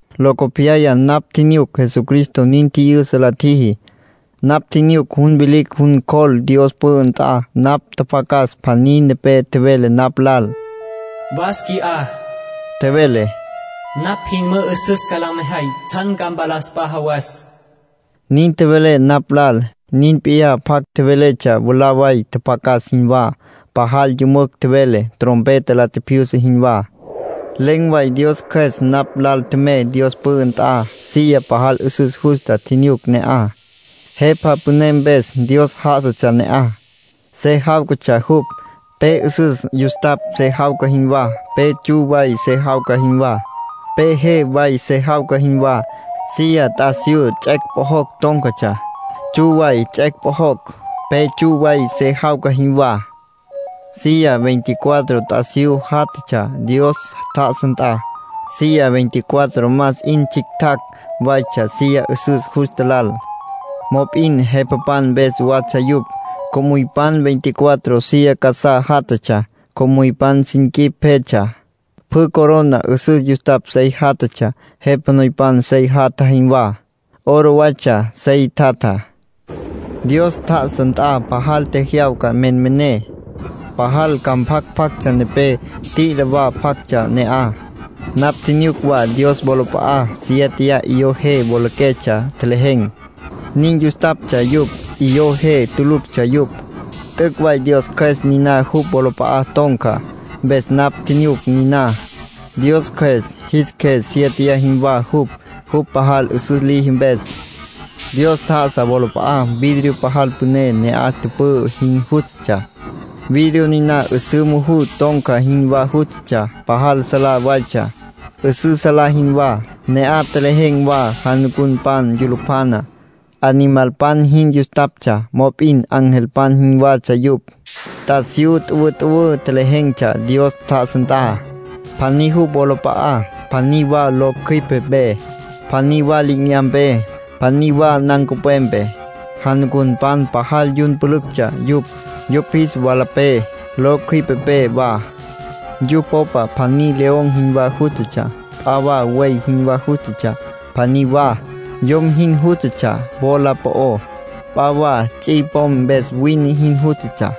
Locopyaya napj tjinyuc Jesucristo nin tji'yüsa la tjiji. Napj tjinyuc jun vilicj jun cjol Dios pü'ü nt'a. Napj tjapjacas pjaní nepé tjevele napj lal. “Was qui'á —tjevele—. Napj jin mü'üsüs ca la mejay tsjan ca mpalas p'a jawas”, nin tjevele napj lal. Nin p'iyá pjac tjevéletsja mwalá way tjapjacas jinwá. Pajal yümücj tjevele, trompeta la tjipjyusa jinwá. Len̈ way Dios Cjües napj lal tjemey Dios pü'ü nt'a. Silla pajal 'üsüs justa tjinyuc ne'aj, Jepa Püné mpes. Dios já'asatsja ne'aj. Se jáwcatsja jupj, pe 'üsüs yustapj se jawca jinwá, pe tsju way se jawca jinwá, pe je way se jawca jinwá. Silla t'asiyú tsets' pjojocj tón̈catsja. Tsju waytsja tsets' pjojocj, pe tsju way se jawca jinwá. Silla veinticuatro t'asiyú játjatsja Dios tjá'asa nt'a. Silla veinticuatro más 'in tsjictjacj waytsja silla 'üsüs justa lal, mop'in jepapan mpes watsja yupj. Co'müypan veinticuatro silla casá játjatsja. Co'müypan sin quip pjetsja. Pjü corona 'üsüs yustapj sey játjatsja, jepa noypan sey jatja jinwá. Oro waytsja sey tjatjá. Dios tjá'asa nt'a pajal tjejyawca menmené, pajal ca mpjac pjactsja nepé, t'i'ila wa pjactsja ne'aj. Napj tjinyuc wa Dios wolap'a'á siéteya 'iyó je wolaquetsja tjelejen̈, nin yustaptsja yupj. 'Iyó je tuluctsja yupj. T'üc' way Dios Cjües niná jupj wolap'a'a ton̈ca, mpes napj tjinyuc niná. Dios Cjües jis qjues siéteya jinwá jupj, jupj pajal 'üsüs liji mpes. Dios tjá'asa wolap'a'á vidrio pajal püné ne'aj tüpü'ü jin jústatsja. Vidrio niná 'üsǘ muju ton̈ca jinwá jústatsja. Pajal salá waytsja, 'üsǘ salá jinwá. Ne'aj tjelejen̈ wa janucunpan yulupjana. Animalpan jin yustaptsja, mop'in angelpan jinwatsja yupj. T'asiyú tüwütüwǘ tjelejen̈tsja Dios tjá'asa nt'a. Pjaní jupj wolap'a'á, pjaní wa lo cjüipe mpe, pjaní wa li'inyampé, pjaní wa nancupwepé. Janucunpan pajal yun pülüctsja yupj, yupj jis walapé, lo cjüipepé wa. Yupj popa pjaní león jinwá jústatsja. P'a wa buey jinwá jústatsja. Pjaní wa, yom jin jústatsja wola po'ó. P'a wa ts'i pom mpes wine jin jústatsja.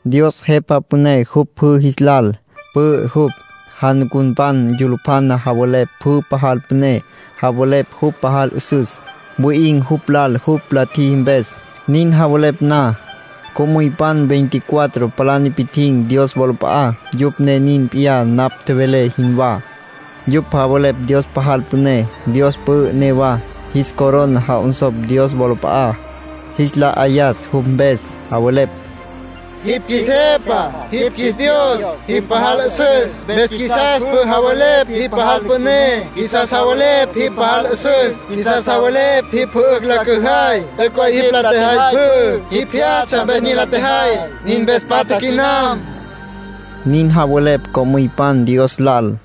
Dios Jepa Püné jupj pjü jis lal. Pü'ü jupj. Janucunpan yulupjana javelepj jupj pajal püné. Javelepj jupj pajal 'üsüs. Wi'in̈ jupj lal jupj la tjiji mpes. Nin javelepj na, co'müypan veinticuatro palá nipi'tjin̈ Dios wolap'a'á. Yupj ne nin p'iyá napj tjevelé jinwá. Yupj javelepj Dios pajal püné. Dios pü'ü newa. Jis corona ja'onsopj Dios wolap'a'á, jis la 'ayas jupj mpes. Javelepj: “Jipj qjuis Jepa. Jipj qjuis Dios. Jipj pajal 'üsüs, mpes qjuisas pjü javelepj jipj pajal püné. Qjuisas javelepj jipj pajal 'üsüs. Qjuisas javelepj jipj pjü 'ücj la cüjay. T'üc' way jipj la tjejay pjü. Jipj jyastsja mpes nin la tjejay. Nin mpes patja quinam”, nin javelepj co'müypan Dios lal.